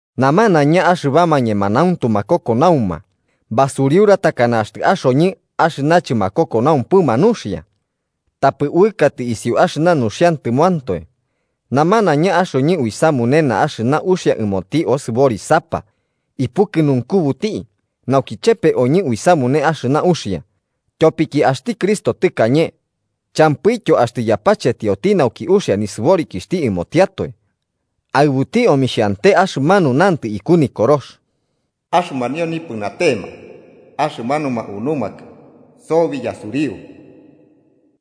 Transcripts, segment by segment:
Namanaiña axɨbama ñemanauntu makokonauma basuriura takana axtɨ axoñɨ axɨna chimakokonaumpɨma nuxia, tapɨ uɨkatɨ isiu axɨna nuxiantɨmoantoe. Namanaiña axoñɨ uisamunena axɨna uxia ɨmoti osɨborisapa ipukɨnunkubuti nauki chepe oñɨ uisamune axɨna uxia. Tyopiki axti Cristo tɨkañe champɨityo axtɨ yapachetioti nauki uxia nisɨborikixhti ɨmotiatoe. Aɨbuti omixhante axɨmanu nantɨ iku Nikorox: “Axɨmanio nipɨnatema axɨmanuma unumakɨ sobi yasuriu.”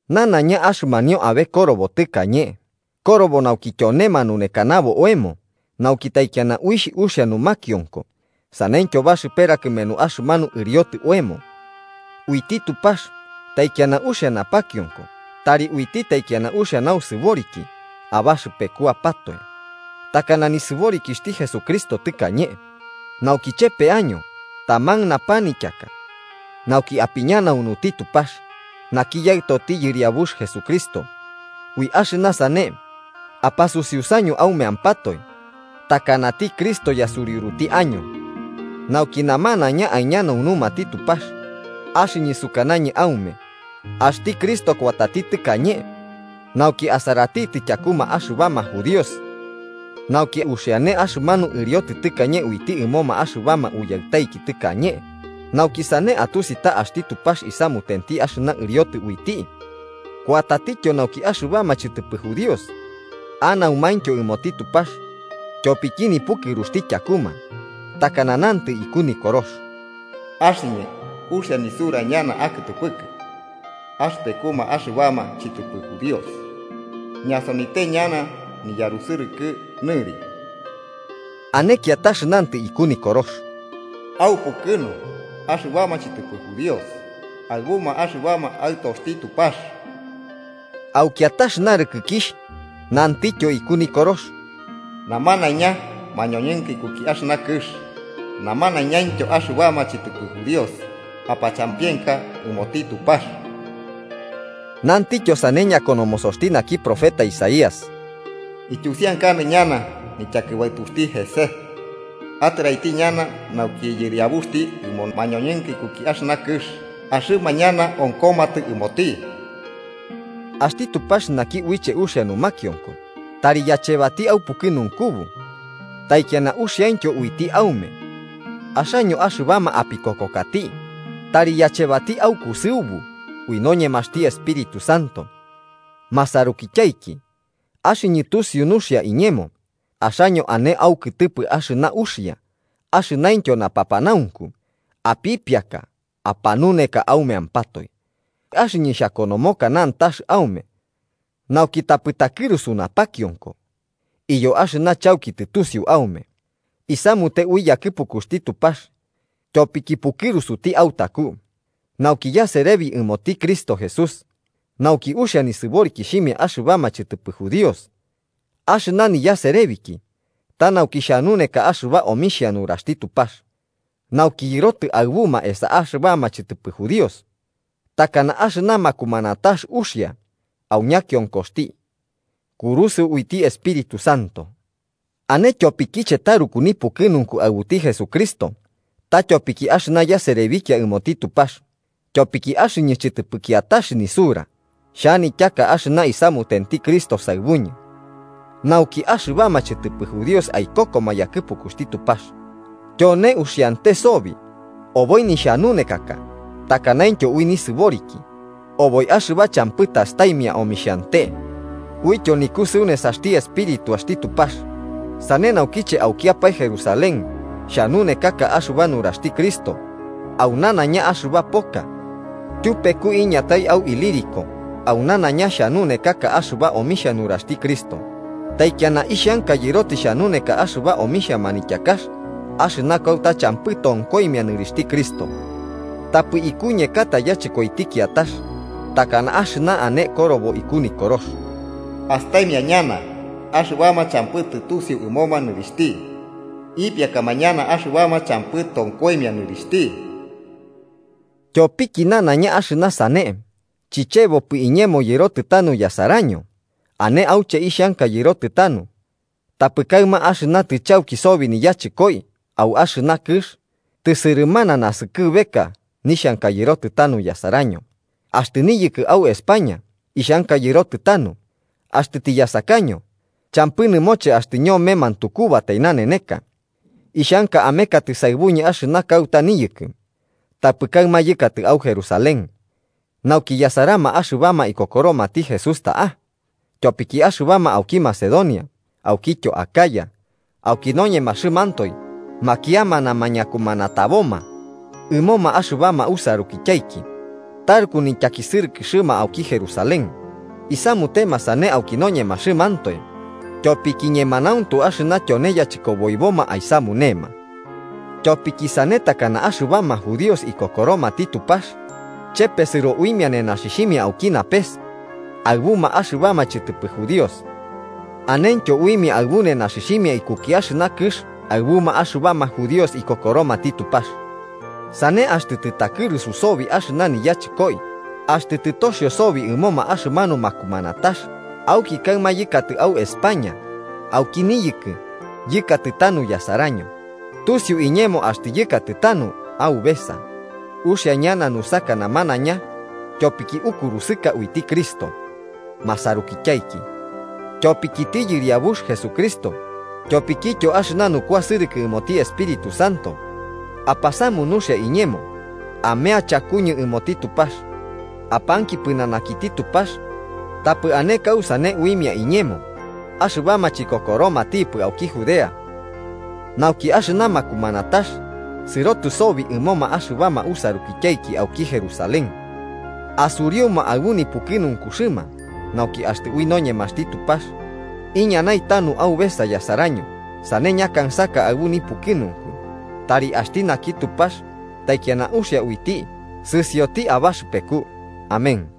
Nanaiña axɨmanio ane korobo tɨkañe, korobo nauki tyone manunekanabo oemo, nauki taikiana uixh uxia numakionko saneityo baxɨpera kɨmenu axɨmanu ɨriotɨ oemo. Uiti Tupax, taikiana uxia napakionko tari uiti taikiana uxia nausɨboriki abaxɨpekuapatoe, takana nisɨborikixhti Jesucristo tɨkañe, nauki chepeaño, taman napanityaka, nauki apiñanaunuti Tupax, naki Yaɨtoti Yɨriabux Jesucristo. Ui axɨna sane, apasusiusaño aumeampatoe, takanati Cristo yasuriuruti año, nauki namanaiña aiñanaunumati Tupax. Axɨñɨ sukanañɨ aume axti Cristo kuatati tɨkañe nauki asaratitɨ tyakuma axɨbama judíos nauki uxiane axɨmanu ɨriotɨ tɨkañe uiti ɨmoma axɨbama uyaɨtaiki tɨkañe nauki sane atusi ta axti Tupax isamutenti axɨna ɨriotɨ uiti. Kuatatityo nauki axɨbama chɨtɨpɨ judíos anaumaintyo ɨmoti Tupax tyopiki nipukɨruxti tyakuma, takana nantɨ iku Nikorox: “Axɨñɨ uxia nisura ñana akɨtɨpɨkɨ axɨpekuma axɨbama chɨtɨpɨ judíos ñasonite ñana niyarusɨrɨkɨ nɨri.” Ane kiatax nantɨ iku Nikorox: “¡Aupukɨnu axɨbama chɨtɨpɨ judíos aɨbuma axɨbama aɨtoxti Tupax!” Au kiatax narɨkɨkixh nantityo iku Nikorox: “Namanaiña mañoñɨnka ikuki axɨna kɨx namanaiñaintyo axɨbama chɨtɨpɨ judíos ¡apachampienka ɨmoti Tupax!” Nantityo sane ñakonomosoxti naki profeta Isaías: “Ityusiankanɨ ñana nityakɨbaɨtuxti Jesé, atɨraiti ñana nauki yɨriabuxti ɨmo mañoñɨnka ikuki axɨna kɨx, axɨma ñana onkomatɨ ɨmoti.” Axti Tupax naki uiche uxia numakionko, tari yachebati aupukɨnunkubu, taikiana axiaintyo uiti aume axaño axɨbama apikokokati, tari yachebati aukusɨubu ui noñemaxti Espíritu Santo. Masarukityaiki, axɨñɨ tusiu nuxia iñemo axaño ane aukɨtɨpɨ axɨna uxia axɨnaintyo napapanaunku apipiaka apanuneka aumeampatoe. Axɨñɨ xhakonomoka nantax aume nauki tapɨ takɨrusu napakionko iyo axɨna chauki tɨtusiu aume, isamute ui yakɨpukuxti Tupax tyopiki pukɨrusuti autaku. Nauki yaserebi ɨmoti Cristo Jesús nauki uxia nisɨborikixhimia axɨbama chɨtɨpɨ judíos, axɨna niyaserebiki ta nauki xhanuneka axɨba omixhia nuraxti Tupax nauki yɨrotɨ aɨbuma esati axɨbama chɨtɨpɨ judíos takana axɨna makumanatax uxia au ñakionkoxti, kurusɨo uiti Espíritu Santo. Ane tyopikiche taruku nipukɨnunku aɨbuti Jesucristo ta tyopiki axɨna yaserebikia ɨmoti Tupax, tyopiki axɨñɨ chɨtɨpɨ kiatax nisura, xhanityaka axɨna isamutenti Cristo saɨbuñɨ nauki axɨbama chɨtɨpɨ judíos aikokoma yakɨpukuxti Tupax. Tyone uxiante sobi oboi nixhanunekaka takanaintyo ui nisɨboriki, oboi axɨba champɨ tastaimia omixhante, uityo nikusɨu nesaxti Espíritu axti Tupax. Sane naukiche aukiapae Jerusalén xhanunekaka axɨba nuraxti Cristo au nanaiña axɨba poka tyupeku iñatai au Ilírico au nanaiña xhanunekaka axɨba omixhia nuraxti Cristo. Taikiana ixhanka yɨrotɨ xhanuneka axɨba omixhia manityakax axɨna kauta champɨ tonkoimia nɨrixhti Cristo, tapɨ ikuñekata yachɨkoiti kiatax. Takana axɨna ane korobo iku Nikorox: “Astaimia ñana axɨbama champɨ tɨtusiu ɨmoma nɨrixhti. Ipiakama ñana axɨbama champɨ tonkoimia nɨrixhti.” Tyopiki nanaiña axɨna sane chichebopɨ iñemo yɨrotɨ tanu yasaraño, ane auche ixhanka yɨrotɨ tanu. Tapɨ kaɨma axɨna tɨchauki sobi niyachɨkoi au axɨna kɨx, tɨsɨrɨmana naskɨbeka nixhanka yɨrotɨ tanu yasaraño, axtɨ niyɨkɨ au España ixhanka yɨrotɨ tanu. Axtɨ tiyasakaño, champɨ nɨmoche axtɨ ñome mantukubatai naneneka, ixhanka amekatɨ saɨbuñɨ axɨna kauta niyɨkɨ. Tapɨ kaɨma yɨkatɨ au Jerusalén, nauki yasarama axɨbama ikokoromati Jesús ta'a. Tyopiki axɨbama auki Macedonia aukityo Acaya auki noñemaxɨmantoe makiamanama ñakumanataboma ɨmoma axɨbama usarukityaiki taruku nityakisɨrɨkɨxɨma auki Jerusalén. Isamutema sane auki noñemaxɨmantoe, tyopiki ñemanauntu axɨma tyone yachɨkoboiboma aisamunema, tyopiki sane takana axɨbama judíos ikokoromati Tupax chepesɨro uimia nenaxixhimia auki napes aɨbuma axɨbama chɨtɨpɨ judíos, anentyo uimia aɨbu nenaxixhimia ikuki axɨna kɨx aɨbuma axɨbama judíos ikokoromati Tupax. Sane, axtɨ tɨtakɨrusu sobi axɨna niyachɨkoi, axtɨ tɨtoxio sobi ɨmoma axɨmanu makumanatax, auki kaɨma yɨkatɨ au España, auki niyɨkɨ yɨkatɨ tanu yasaraño. Tusiu iñemo axtɨ yɨkatɨ tanu aubesa, uxia ñana nusaka namanaiña tyopiki ukurusɨka uiti Cristo. Masarukityaiki, tyopikiti Yɨriabux Jesucristo tyopikityo axɨna nukuasɨrɨkɨ ɨmoti Espíritu Santo, apasamu nuxia iñemo amea chakuñɨ ɨmoti Tupax. Apanki pɨnanakiti Tupax tapɨ ane kausane uimia iñemo axɨbama chikokoromatipɨ auki Judea, nauki axɨna makumanatax sɨrotɨ sobi ɨmoma axɨbama usarukityaiki auki Jerusalén asuriuma aɨbu nipukɨnunkuxɨma, nauki axtɨ ui noñemaxti Tupax, iñanai tanu aubesa yasaraño sane ñakansa aɨbu nipukɨnunku. Tari axti naki Tupax taikiana uxia uiti sɨsioti abaxɨpeku. Amén.